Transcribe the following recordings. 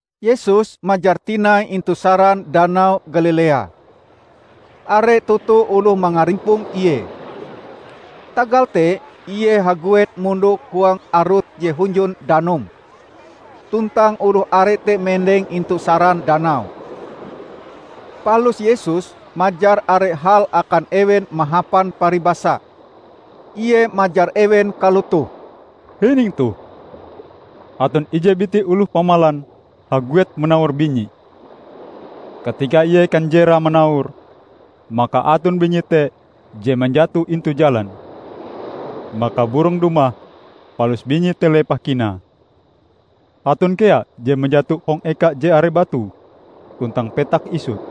Yesus majar tinai intu saran Danau Galilea. Are toto oloh mangarimpong Ie. Tagal te Ie haguet mondok huang arut je hunjun danum, tuntang oloh are te mendeng intu saran danau. Palus Yesus majar are hal akan ewen mahapan paribasa. Ie majar ewen kalotoh. "Hining toh! Aton ije biti oloh pamalan haguet manawor binyi. Katika ie kanjerae manawor, maka aton binyi te je manjato intu jalan. Maka burong dumah palus binyi te lepah kinae. Aton kea je manjato hong eka je are batue tuntang petake isut.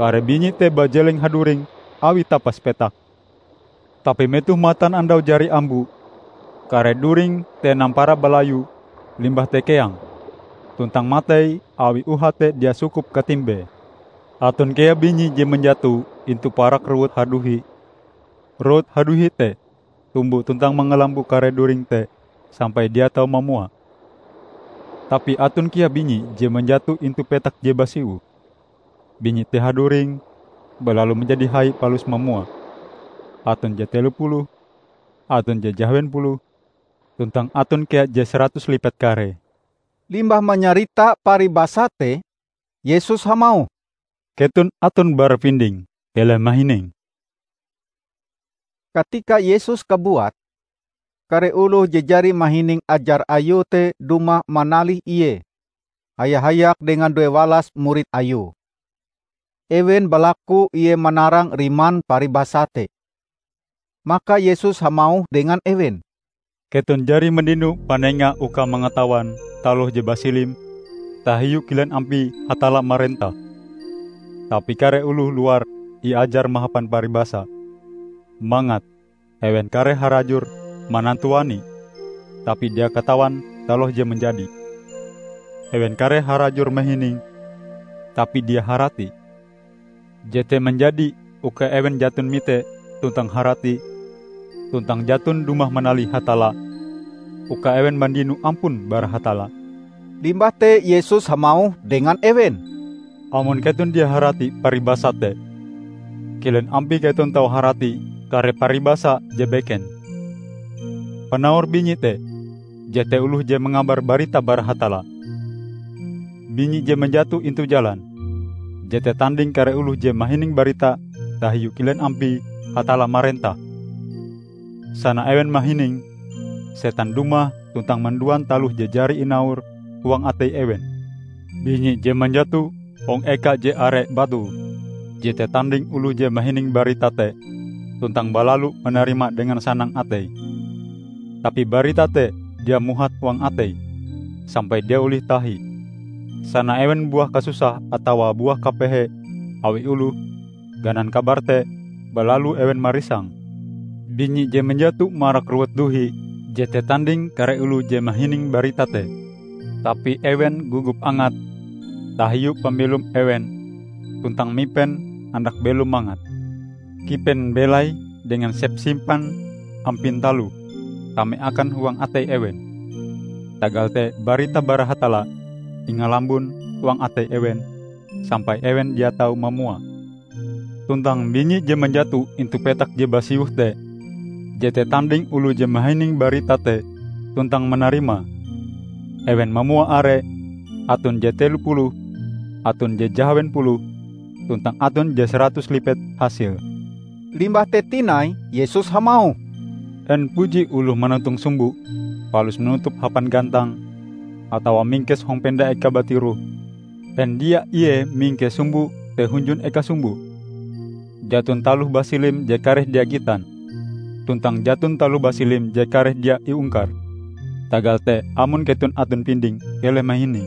Kare binyi te bajeleng haduring awie tapas petake, tapi metoh matanandau jari ambo, kare duringe te nampara balayu limbah te keang tuntang matei awi uhate dia sukup katimbee. Aton kea binyi je manjato intu parak rowut haduhi. Rowut haduhi te tumbo tuntang mangalambo kare during te sampai dia tau mamua. Tapi aton kea binyi je manjato intu petak je basiwoh. Binyi te haduring, balalu manjadi hai palus mamua, aton je telo puluh, aton je jahawen puluh, tuntang aton kea je saratus lipet karee." Limbah manyarita paribasa te Yesus hamauh, "Keton aton bara pinding keleh mahining!" Katika Yesus kabuate, kare oloh je jari mahining ajar Ayue te dumah manalih Ie haya-hayak dengan duewalas murid Ayue. Ewen balaku Ie manarang riman paribasa te. Maka Yesus hamauh dengan ewen, "Keton jari mandino panenga uka mangatawan taloh je basilim tahiu kilen ampie Hatalla marentah. Tapi kare oloh luar iajar mahapan paribasa, mangat 'Ewen kareh harajur manantuanie tapi dia katawan taloh je manjadi, ewen kareh harajur mahining, tapi dia haratie, jete manjadi uka ewen jaton mitee tuntang haratie tuntang jaton dumah manalih Hatalla uka ewen mandino ampun bara Hatalla.' " Limbah te Yesus hamauh dengan ewen, "Amon keton dia harati paribasa te, kilen ampie keton tau harati kare paribasa je beken? Panawor binyi te, jete oloh je mangabar barita bara Hatalla. Binyi je manjato intu jalan, jete tanding kare oloh je mahining barita tahiu kilen ampie Hatalla marentah. Sana ewen mahininge, setan dumah tuntang manduan taloh je jari inawor huang atei ewen. Binyi je manjato hong eka je are batue, jete tanding oloh je mahining barita te, tuntang balalu manarimae dengan sanang atei. Tapi barita te dia muhat huang ateie, sampai dia olih tahi. Sana ewen buah kasusah atawa buah kapehe awi oloh ganan kabar te, balalu ewen marisang. Binyi je manjato marak rowut duhi, jete tanding kare oloh je mahining barita te, tapi ewen gogop angate tahiu pambelom ewen tuntang mipen handak belom mangat. Kipen belai dengan sepsimpan ampin taloh, tame akan huang atei ewen. Tagal te barita bara Hatalla ingalambon huang atei ewen, sampai ewen dia tau mamua. Tuntang binyi je manjato intu petak je basiwoh te, jete tanding oloh je mahining barita te tuntang manarimae, ewen mamua are, aton je telo puluh, aton je jahawen puluh, tuntang aton je saratus lipet hasile." Limbah te tinai Yesus hamauh, "En puji oloh manotong sumbo palus manutupe hapan gantang, atawa mingkese hong penda eka batiroh? En dia ie mingkes sumbo te hunjun eka sumbo? Jaton taloh basilim je kareh dia gitan; tuntang jaton taloh basilim je kareh dia iungkar. Tagal te amon keton aton pinding, keleh mahining!"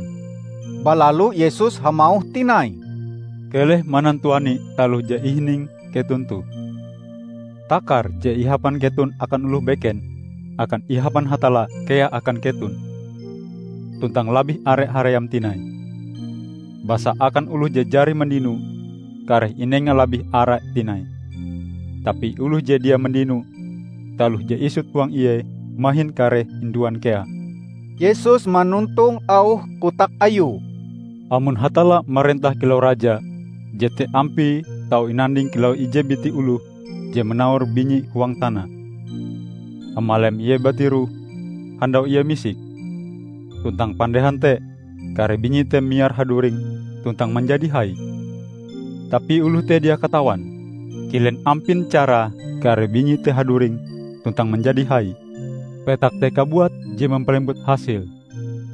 Balalu Yesus hamauh tinai, "Keleh manantuani taloh je ihining keton toh! Takar je ihapan keton akan oloh beken, akan ihapan Hatalla kea akan keton -- tuntang labih are haream tinai. Basa akan oloh je jari mandino, kareh inenga labih are tinai, tapi oloh je dia mandino, taloh je isut huang ie mahin kareh induan kea." Yesus manontong auh kotak Ayue, "Amon Hatalla marentah kilau Raja, jete ampie tau inanding kilau ije biti oloh je manawor binyi huang tanae. Hamalem ie batiroh; handau ie misik. Tuntang pandehan te kare binyi te miar haduring tuntang manjadi hai. Tapi oloh te dia katawan, kilen ampin carae kare binyi te haduring tuntang manjadi hai. Petak te kabuat je mampalembut hasil: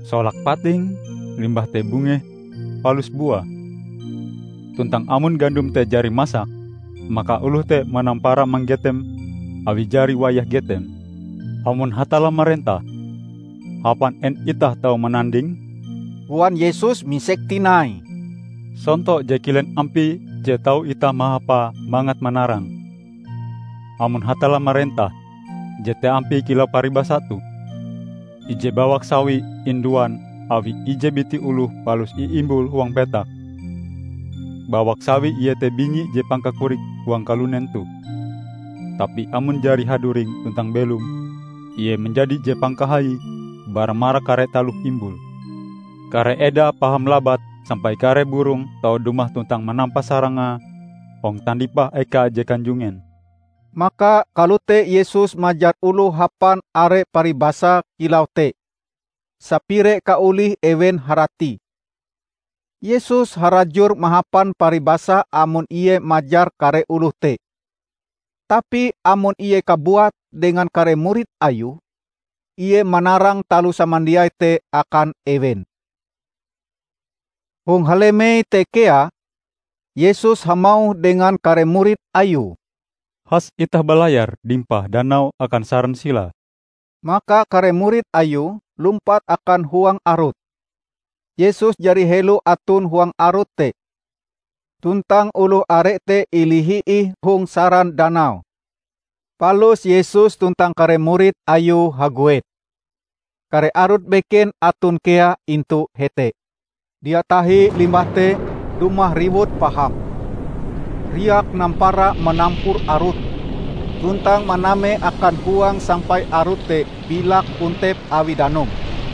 solake patinge, limbah te bungehe, palus buae. Tuntang amon gandum te jari masak, maka oloh te manampara manggetem awi jari wayah getem." "Amon Hatalla marentah, hapan en itah tau manandinge?" koan Yesus misek tinai. "Sonto je kilen ampie je tau itah mahapae mangat manarange? Amon Hatalla marentah, jete ampie kilau paribasa toh: Ije bawak sawi induan awi ije biti oloh palus iimbule huang petak. Bawak sawi iete binyi je pangkakorike huang kalunen toh. Tapi amon jari haduring tuntang belom, ie manjadi je pangkahaie bara marak kare taloh imbul. Kare edae paham labat sampai kare burong tau dumah tuntang manampa sarangae hong tandipah ekae je kanjungen." Maka kalote Yesus majar oloh hapan are paribasa kilau te, sapire kaolih ewen haratie. Yesus harajur mahapan paribasa amon Ie majar kare oloh te. Tapi amon Ie kabuate dengan kare murid Ayue, Ie manarang taloh samandiai te akan ewen. Hong halemei te kea, Yesus hamauh dengan kare murid Ayue, "Has itah balayar dimpah danau akan saran silae." Maka kare murid Ayue lumpat akan huang arut -- Yesus jari helo aton huang arut te -- tuntang oloh are te ilihi ih hong saran danau. Palus Yesus tuntang kare murid Ayue haguet. Kare arut beken aton kea intu hete. Dia tahi limbah te dumah riwut paham. Riak nampara manampur arut tuntang maname akan huang sampai arut te bilak kontep awi danum.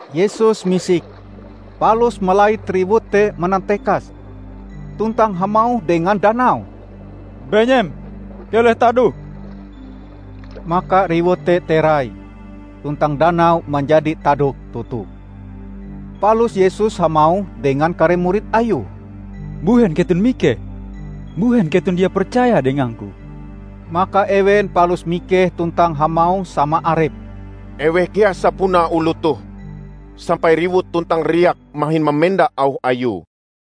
Yesus misik, palus malait riwut te manantekas, tuntang hamauh dengan danau, "Benyem, keleh tadoh!" Maka riwut te terai, tuntang danau manjadi tadoh toto. Palus Yesus hamauh dengan kare murid Ayue, "Mbuhen keton mikeh? Mbuhen keton dia percaya dengangku?" Maka ewen palus mikeh tuntang hamauh sama arepe, "Eweh kea sapunae Oloh toh, sampai riwut tuntang riak mahin mamenda auh Ayue."